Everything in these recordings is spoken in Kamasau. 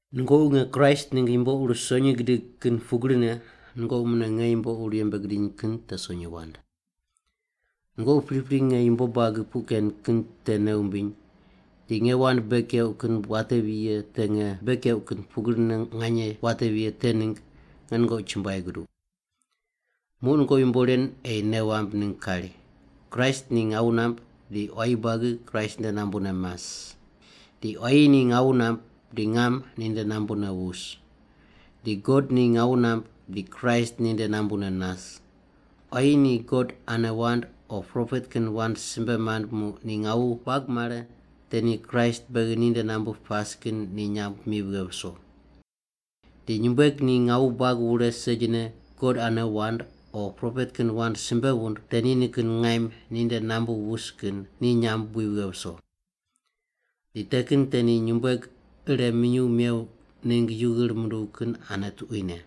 Nungoqi nge Kraist ningg yumbo ur sonyi gidig kin pugrine nungoqi mune nge yumbo ur yembe gidiny kin te sonyi wand. Nungoqi pripri nge yumbo buagi puq ken kin te nei wumbiny di nge wand bei keuq kin watevi ye te nge bei keuq kin pugrine nganye watevi ye te ningg nge nungoqi chumbuai guduq. Muq nungoqi yumbo ren ei nei wamb ningg kari, Kraist ni ngawu namb di quayi buagi Kraist nde nambune mas. Di quayi ni ngawu namb di ngam ninde nambune wus. Di God ni ngawu namb di Kraist ninde nambune nas. Quayi ni God ane wand o propet kin wand simbe mand muq ni ngawu buag mare te ni Kraist beghi ninde nambu pas kin ni nyamb mi vighe viso. Di nyumbueg ni ngawu buag wure segine God ane wand o propet kin wand simbe wund te ni nikin ngaim ninde nambu wus kin ni nyamb wi vighe viso. Di te kin te ni nyumbueg ire minyuw mew ningg yu ghir munduw kin ane tuquine.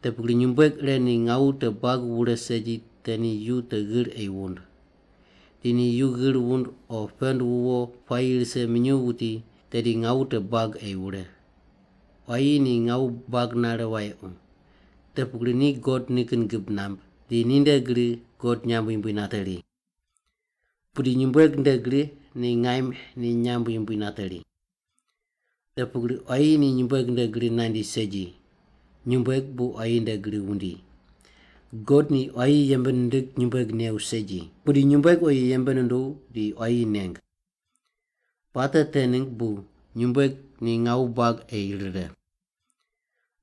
Te pugri nyumbueg ire ni ngawu te buag wure segi te ni yu te ghir ei wund. Di ni yu ghir wund o pend wuwo puayi rise minyuw wuti, tedi ngawu te buag ei wure. Quayi ni ngawu buag nare wayequ. Te pugri ni God nikin gib namb, di ninde gri God nyamb yumbui nateri. Pudi nyumbueg nde gri ni ngaim ni nyamb yumbui nateri. Te pugri quayi ni nyumbueg nde gri nandi segi, nyumbueg bu quayi nde gri wundi. God ni quayi yembe nindig nyumbueg new segi, pudi nyumbueg oyi yembe nunduw di quayi neng. Puate te ningg bu nyumbueg ni ngawu buag ei rire.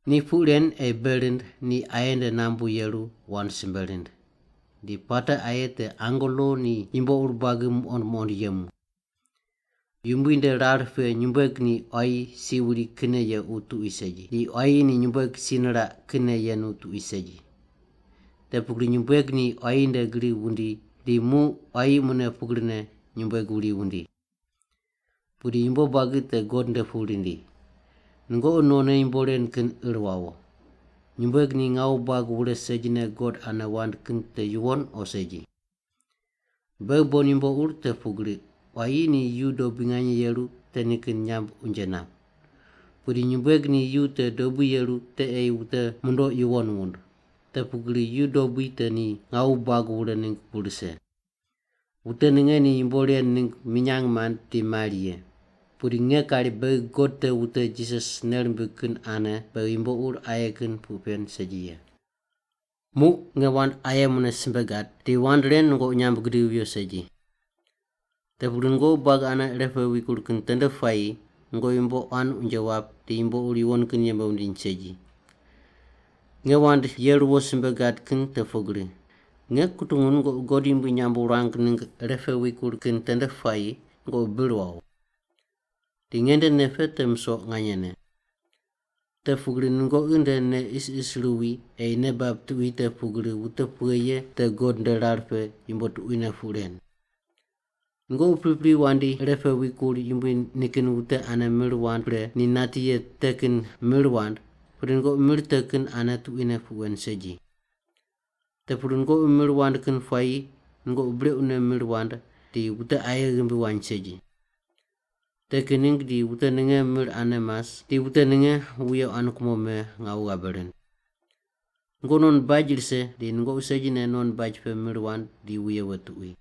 Ni puq ren ei bei rind ni aye nde nambu yeru wand simbe rind. Di puate aye te angelo ni yumbo ur buagi muqond muqond yemu. Yumbui nde rar pe nyumbueg ni quayi si wuri kinne yequ tuqui segi, di quayi ni nyumbueg si niraq kinne yenu tuqui segi. Te pugri nyumbueg ni quayi nde gri wundi di muq quayi mune pugrine nyumbueg wuri wundi. Pudi yumbo buagi te God nde pu rindi. Nungoqi nonne yumbo ren kin ir wawo. Nyumbueg ni ngawu buag wure segine God ane wand kin te yuwon o segi? Beghi bon yumbo ur te pugri quayi ni yu dobui nganye yeru te nikin nyamb unje nap. Pudi nyumbueg ni yu te dobui yeru te ei wute mundoq yuwon wund. Te pugri yu dobui te ni ngawu buag wure ningg bu rise. Wute ninge ni yumbo ren ningg minyang mand di mari ye. Pudi nge kari beghi God te wute Jisas nei rimbig kin ane beghi yumbo ur aye kin puq pen segi ye. Muq nge wand aye mune simbe gad di wand ren nungoqi nyamb gidivi viyo segi. Te pugri nungoqi buagi ane irepe wikur kin tende puayi nungoqi yumbo quan unje wap di yumbo ur yuwon kin yembe wundiny segi. Nge wand ye ruwo simbe gad kin te pugri: Nge kutungu nungoqi God yumbui nyamb wurang ningg irepe wikur kin tende puayi nungoqi bir wawo. Di nge nde nei pe te musoq nganyene. Te pugri nungoqi nde nei isis ruwi ei nei bab tuqui te pugri wute pughe ye te God nde rar pe yumbo tuquine puq ren. Nungoqi pripri wandi ire pe wikur Yumbui nikin wute ane mir mand pre ni nati ye te kin mir wand, pudi nungoqi mir te kin ane tuquine puq wen segi. Te pugri nungoqi mir wand kin puayi nungoqi brequne mir wand di wute aye ghimbi wany segi. Te kin ningg di wute ninge mir ane mas di wute ninge wuye quan kumo me ngawu ghabe rind. Nungoqi non baj rise di nungoqi segine non baj pe mir wand di wuye we tuqui.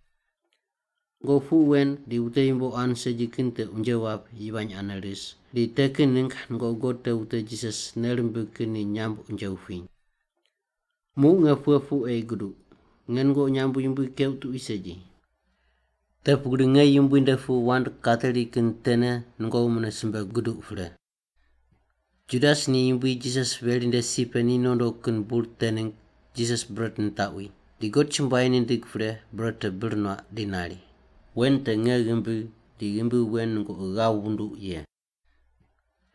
Nungoqi puq wen di wute yumbo quan segi kin te unje wap yivany ane ris, di te kin ningg nungoqi God te wute Jisas nei rimbig kin ni nyamb unje wupiny. Muq nge pughe puq ei guduq? Nge nungoqi nyamb yumbui keuq tuqui segi. Te pugri nge Yumbui nde pu wand kateri kin tene nungoqi mune simbe guduq pre. Judas ni Yumbui Jisas veri nde si pe ni nondo kin bur te ningg Jisas bret nitaqwi, di God chumbuai nindig pre bret te bir nuaq di nari, “Wen te nge ghimbi di ghimbi wen nungoqi ghav wunduq ye.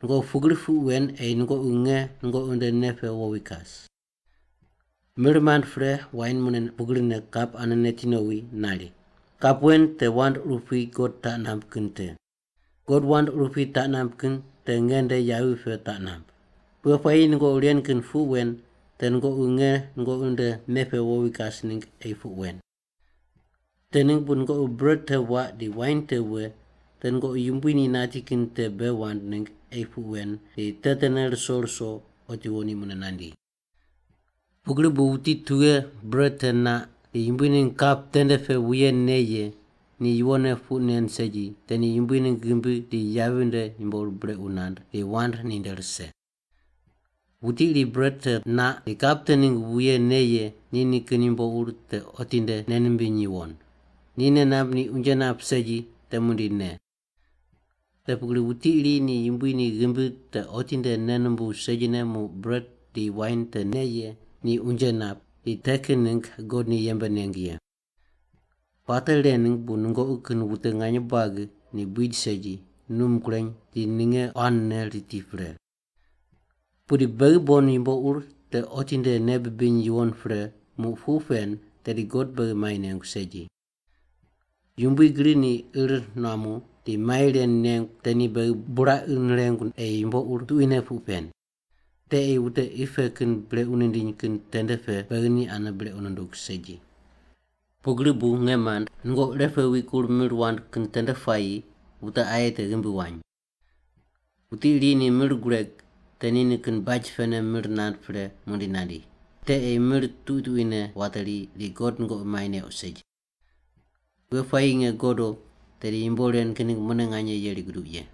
Nungoqi pugri puq wen ei nungoqi nge nungoqi nde nei pe wowi kas.” Mir mand pre wain mune pugrine kap ane neti nowi nari, “Kap wen te wand urupui God taq namb kin te. God wand urupui taq namb kin te nge nde yavi pe taq namb. Pughe puayi nungoqi ren kin puq wen te nungoqi nge nungoqi nde nei pe wowi kas ningg ei puq wen.” Te ningg bu nungoqi bret te waq di wain te we te nungoqi Yumbui ni nati kin te bei wand ningg ei puq wen di te tene ruso ruso otiwo ni mune nandi. Pugri bu wuti tughe bret te naq di Yumbui ningg kap tende pe wuye ne ye ni yuwonne puq nen segi te ni Yumbui ningg ghimbi di yavi nde yumbo ur brequ nand di wand ninde rise. Wuti iri bret te naq di kap te ningg wuye ne ye ni nikin yumbo ur te otinde nei nimbiny yuwon. Ni nei namb ni unje nap segi te muqdi ne. Te pugri wuti iri ni Yumbui ni ghimbi te otinde nei numbuw segine muq bret di wain te ne ye ni unje nap di te kin ningg God ni yembe neng ye. Puate ren ningg bu nungoqi kin wute nganye buagi ni buid segi, num kureny di ninge quanne riti pre. Pudi beghi bon yumbo ur te otinde nei bibiny yuwon pre muq puq pen tedi God beghi mai nengu segi. Yumbui gri ni ir nuamu di mai ren nengu te ni beghi buraqi nirengu ei yumbo ur tuquine puq pen. Te ei wute qi pe kin brequ nindiny kin tende pe beghi ni ane brequ nundug segi. Pugri bu, nge mand, nungoqi irepe wikur mir wand kin tende puayi wute aye te ghimbi wany. Wuti iri ni mir gureg, te ni nikin baj pene mir nand pre muqdi nandi. Te ei mir tuqui tuquine wateri di God nungoqi mai neuq segi. Pughe puayi nge godo tedi yumbo ren kin ningg mune nganye yeri guduq ye.